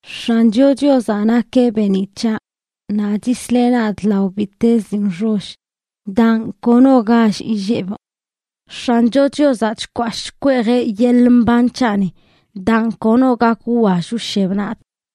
X̱ancho Chiozaꞌ nakeꞌ beeniꞌ c̱haꞌ, naꞌ chisleꞌ nadꞌ lao bittez dii nxoll, daan, kono gall illebꞌ. X̱ancho Chiozaꞌ chkwashꞌ chkweejeꞌ yeḻꞌ mban c̱haꞌni, daan, kono gak wwall wsheb nadꞌ.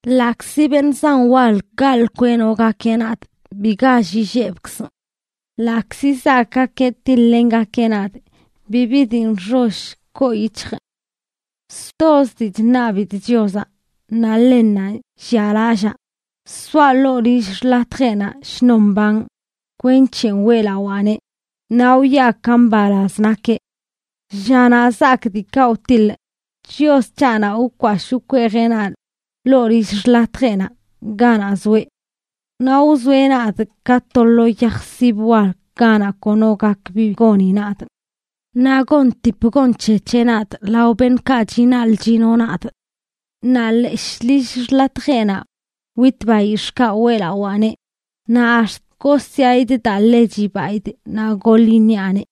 Ḻaꞌkzi beṉꞌ zan wal gaḻꞌ kweꞌnogakeꞌ nadꞌ, bi gall illebkzꞌ. Ḻaꞌkzi zaakgakeꞌ tiḻ-lengakeꞌ nadꞌ, bibi dii nxoll koo yic̱hjꞌ. Stozə dii chṉabidꞌ Chiozaꞌ, naꞌ ḻennanꞌ llialallaa: soaꞌ ḻoo lill xḻatjeꞌnaꞌ shnon mbanꞌ, kwenc̱he weꞌlawaaneꞌ naꞌ wwiaꞌ ka mbalaz nakeꞌ. Llanaꞌ zaak diikaꞌ wtiḻꞌ, Chios c̱haꞌnaꞌ wkwashꞌ wkweejeꞌ nadꞌ ḻoo lill xḻatjeꞌnaꞌ, ganaꞌ zoeꞌ. Naꞌ wzoeꞌ nadꞌ ka to lo yaj sib wal ganaꞌ kono gak bi goni nadꞌ. Naꞌ gontip gonc̱hec̱heꞌ nadꞌ lao beṉꞌkaꞌ chinaḻꞌ chino nadꞌ. Naꞌ leshꞌ lill xḻatjeꞌnaꞌ witꞌ bayix̱ꞌkaꞌ weꞌlawaaneꞌ, naꞌ ax̱t gosyaꞌidꞌ daa ḻe chibaidꞌ naꞌ goḻ iṉiaꞌneꞌ.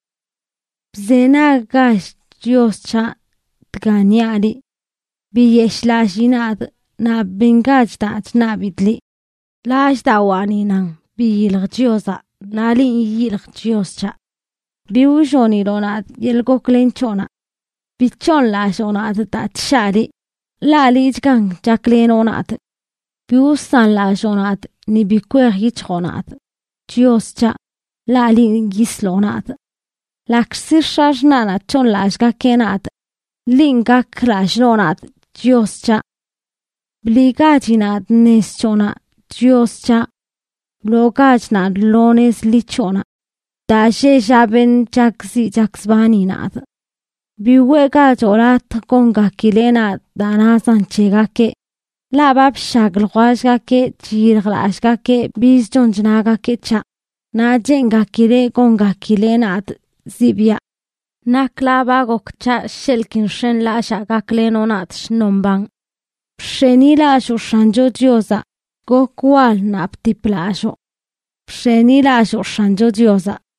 Bzenaggach, Chios c̱haꞌ, dga niaꞌ liꞌ. ¡Biyeshꞌlallii nadꞌ naꞌ bengach daa chṉabidꞌ liꞌ! Lallꞌdawaani nan: “Biyilj Chiozaꞌ.” Naꞌ linꞌ yiyiljꞌ, Chios c̱haꞌ. Bi wlloniloꞌ nadꞌ yeḻꞌ goklen c̱hoꞌnaꞌ. Bi c̱hooṉlalloo nadꞌ daa chshaa liꞌ, ḻaꞌ liꞌchgan chaklenoꞌ nadꞌ. Bi wsanlalloo nadꞌ ni bi kwej yic̱hjoꞌ nadꞌ, Chios c̱haꞌ, ḻaꞌ linꞌ yisloꞌ nadꞌ. Ḻaꞌkzi x̱axṉaꞌnaꞌ c̱hooṉlallꞌgakeꞌ nadꞌ, linꞌ gak lallꞌ noo nadꞌ, Chios c̱haꞌ. Bliꞌgachi nadꞌ nez c̱hoꞌnaꞌ, Chios c̱haꞌ. Wloogach nadꞌ lo nez ḻi c̱hoꞌnaꞌ, daa lleꞌ llaꞌ beṉꞌ chakziꞌ chakzbani nadꞌ. Bi weꞌgachoꞌ latj gongakileꞌ nadꞌ daa nazan c̱hegakeꞌ; ḻaꞌ ba bshag ljwellgakeꞌ chyiljlallꞌgakeꞌ bizə chon chnagakeꞌ c̱haꞌ, naꞌ cheengakileꞌ gongakileꞌ nadꞌ zibiaꞌ. Nakla ba gok c̱haꞌ sheḻꞌ ki nx̱enlallaa gaklenoꞌ nadꞌ shnon mbanꞌ. ¡Bx̱enilalloo X̱ancho Chiozaꞌ! ¡Gok wal naꞌ btip lalloo! ¡Bx̱enilalloo X̱ancho Chiozaꞌ!